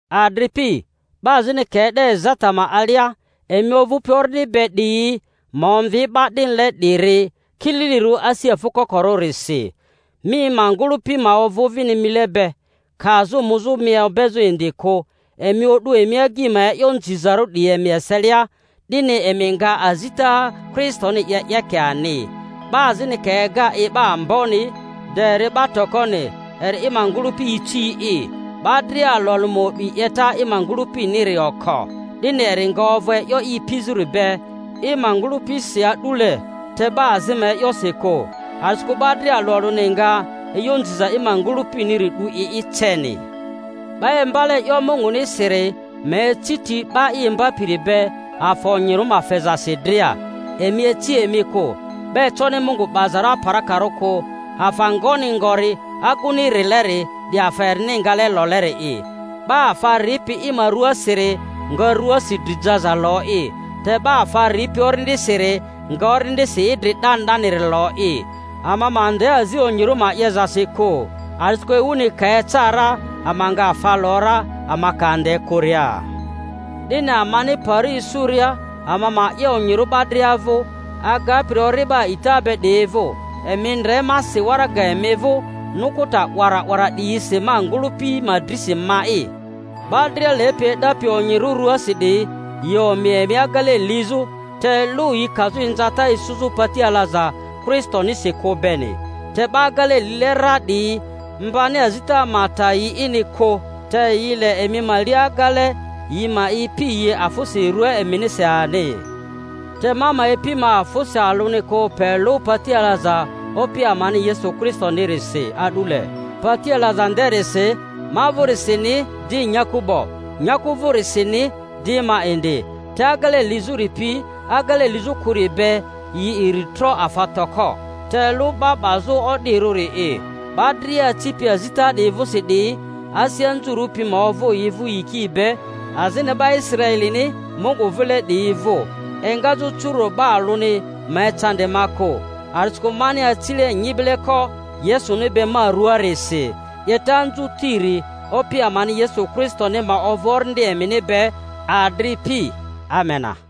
Adripi, 'ba azini ka e'de ezata ma alia, emi ovᴜpi Orindi be 'diyi ma omvi 'ba 'dinile 'diri kililirᴜ asi afᴜ kokorᴜrisi. Mi ma ngᴜlᴜpi ma ovᴜ vini mile be, kazᴜ muzᴜ mi obezᴜ indi kᴜ. Emi o'du emi agyi ma e'yo nzizarᴜ 'diyi emi eselia, 'dini emi nga azita Kristoni 'ye 'yeke ani. 'Ba azini ka ega i 'ba amboni, de eri 'ba tokoni, eri i ma ngᴜlᴜpi ici'i. 'Ba dria alᴜ alᴜ ma o'bi 'yeta i ma ngᴜlᴜpiniri oko, 'dini eri nga ovᴜ e'yo i ipizᴜri be i ma ngᴜlᴜpisi a'dule, te 'ba azi ma e'yosi kᴜ. A'disikᴜ 'ba dria alᴜ alᴜni nga e'yo nziza i ma ngᴜlᴜpiniri 'du i'i ceni. 'Ba imbale e'yo Mungunisiri ma eci ti 'ba i imbapiri be afa onyirᴜ ma fezasi dria. Emi ici emi kᴜ; 'ba econi Mungu 'bazarᴜ aparakarᴜ kᴜ, afa ngoni ngori aguni rileri, 'di afa erini ngale loleri'i. 'Ba afa ripi i ma rᴜasiri nga ruasi dri jaza lo'i; te 'ba afa ripi Orindisiri nga Orindisi idri 'dani 'daniri lo'i. Ama ma ande azi onyirᴜ ma 'yezasi kᴜ, a'disikᴜ ewuni ka eca ra ama nga afa lo ra, ama ka ande kᴜria. 'Dini amani pari isuria, ama ma 'ye onyirᴜ 'ba dria vᴜ, agapiri ori'ba a'ita be 'diyi vᴜ. Emi ndre ma si waraga emi vᴜ nukuta 'wara 'wara 'diyisi ma ngᴜlᴜ-pi ma drisi ma'i. 'Ba dria lepi e'dapi onyirᴜ ruasi 'diyi, yi omi emi agele lizᴜ, te lᴜ yi kazᴜ inzata isuzᴜ pati alaza Kristonisi kᴜ beni. Te 'ba agele lile ra 'diyi mbani azita ma ta yi'ini kᴜ, te yi le emi ma li agele yi ma ipi yi afᴜsi rua eminisi ani. Te ma ma ipi ma afᴜsi alᴜni kᴜ pe lᴜ pati alaza Opi amani Yesu Kristonirisi a'dule, pati alaza nderisi ma vᴜrisini di nyaku 'bo, nyaku vᴜrisini di ma indi. Te agele lizᴜri pi agele lizᴜ kᴜri be yi iri tro afa toko, te lᴜ 'ba 'bazᴜ o'dirᴜri'i. 'Ba dria acipi azita 'di vᴜsi 'diyi, asi anzurᴜ pi ma ovᴜ yi vᴜ yiki be, azini 'ba Israelini Mungu vile 'diyi vᴜ. Engazᴜ curu'do 'ba alᴜni ma ecandi ma kᴜ; a'disikᴜ mani acile nyibeleko Yesuni be ma ruaarisi. 'Yeta anzutiri Opi amani Yesu Kristoni ma ovᴜ orindi emini be, adripi. Amena.